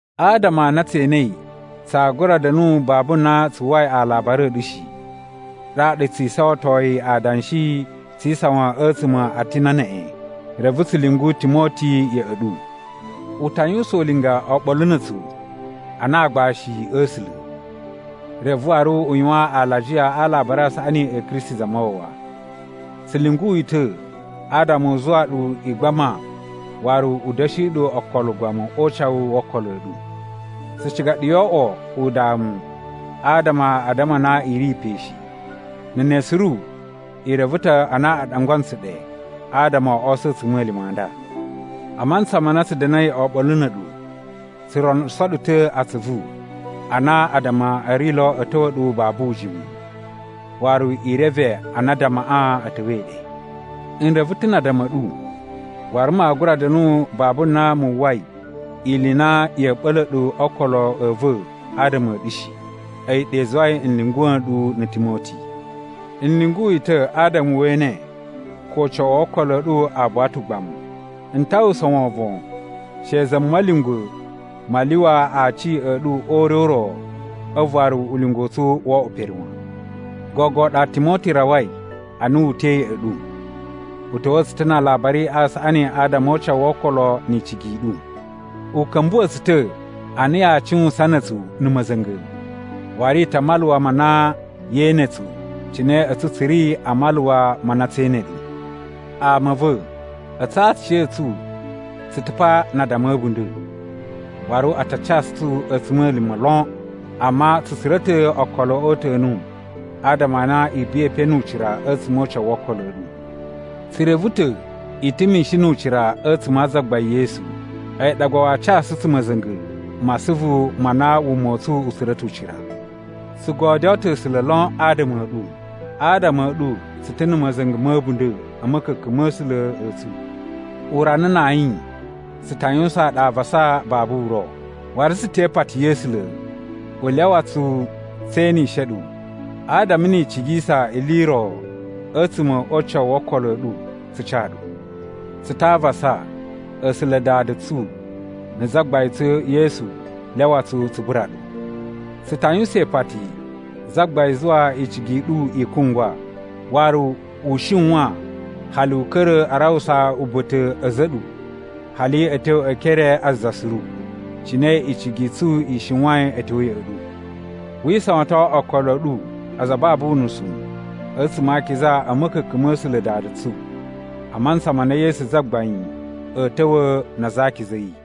Adama a na tse enei tsaa gura da̱nu babu na tsu uwwai alabari a̱ ɗu shi, ɗaɗa tsu isawantoyi adanshi tsi isawan a̱tsuma̱ a Atina neꞌen, reve tsu lyungu Timoti ya̱ꞌa̱ ɗu. U ta yuwusan ulinga oɓolo na̱ a̱tsu ana aagbashi a̱ A̱sula̱, reve waru u yuwan alajiya a Alabari a Saꞌani a̱ Kristi Zamawawa. Tsu lyungu yi ta̱ adama u zuwa ɗu i gbama waru u da̱shi ɗu okolo ugbamu o ucawu wo okolo a̱ ɗu. Tsu ciga ɗu yoo oꞌwo udamu adama a addama a na i ri pe shi. Na̱ ne suru, i reve ta̱ a na a ɗangwa ntsu ɗe adama o oso a̱ a̱tsuma̱lima̱ a nda. A mantsa ma na tsu da̱na̱i oɓolo na̱ a̱ɗu tsu ronuso ɗu ta̱ atsuvu a na addama a̱ ri lo a̱ ta̱wa̱ ɗu babu ujimu. Waru i reve a na addamaꞌa a̱ ta̱wa̱i ɗe. N reve ta̱ na addama a̱ ɗu, waru maa gura da̱nu babu na mu uwwai ili i na ya̱a̱ ɓa̱la̱ ɗu o okolo a̱ va̱ adama a̱ ɗu shi. A̱yi ɗa i zuwai n lyunguwa̱ nɗu na̱ Timoti. N lyungu yi ta̱ adama we ene ko ucawu wo okolo a̱ ɗu a buwa ta̱ ugbamu. N ta uwwusa wovon she Za Ma̱lyungwa̱ ma lyuwa aci a̱ ɗu o ure u ro a̱vu waru ulinga u tsu woo oꞌwo pere wan. Gogo ɗa Timoti rawai ana wu uta̱i ya̱ꞌa̱ ɗu. U ta̱wa̱a̱ tsu ta̱ na alabari a saꞌani adama o ucawu wo okolo ni icigi i ɗu. U ka̱mbuwa̱ tsu ta̱ a na yaa cuwusan na̱ a̱tsu na̱ ma̱za̱nga̱, waru i ta maluwa ma na yee ene tsu cine a̱tsu tsu ri a maluwa ma na tsee ene ɗu. Ama a̱ va̱, a̱tsu a aciya̱tsu tsu ta̱ pa na addama a̱ a̱bunda̱, waru a ta casu tsu a̱tsuma̱lima̱ lon, amma tsu tsura̱ ta̱ okolo o uta̱nu adama a na i buwai pe nu ucira a̱tsuma̱ o ucawu wo okolo a̱ ɗu. Tsu reve ta̱ i ta̱ mishin nu ucira a̱tsuma̱ a Zagbain Yesu, a̱yi ɗa gba waa casu tsu ma̱za̱nga̱ ma asuvu ma na wuma u tsu u tsura̱ ta̱ ucira. Tsu godyoo ta̱ A̱sula̱ lon adama a̱ ɗu! Adama a̱ ɗu tsu ta̱ na̱ ma̱za̱nga̱ ma̱ a̱bunda̱ a̱ ma̱ka̱ka̱n ma̱ A̱sula̱ a̱ tsu. Urana na ayin tsu ta yuwusaan ɗu avasa babu uro. Waru tsu te ipati ya̱ A̱sula̱ u lyawa tsu tse enishe ɗu adama ni i cigisa ili i ro a̱tsuma̱ o ucawu wo okolo a̱ ɗu, tsu ca ɗu. Tsu ta avasa A̱sula̱ Dada tsu na̱ Zagbain tsu Yesu lyawa tsu tsu bura ɗu. Tsu ta yuwusan ipati Zagbain zuwa icigi i ɗu i kungwa, waru u shiwan hali u ka̱ra̱ a rawusa uba̱ta̱ a̱za̱ a̱ ɗu hali a̱ tyo e ekere a za suru, cine icigi i tsu i shiwain a̱ tyo ya̱ꞌa̱ ɗu. Wi isawaton okolo a̱ ɗu aza a babu unusu a̱tsuma̱ a akiza a̱ ma̱ka̱ka̱n ma̱ A̱sula̱ Dada tsu, a mantsa ma na Yesu Zagbain a̱a̱ ta̱wa̱ na aza a akiza a̱ yi.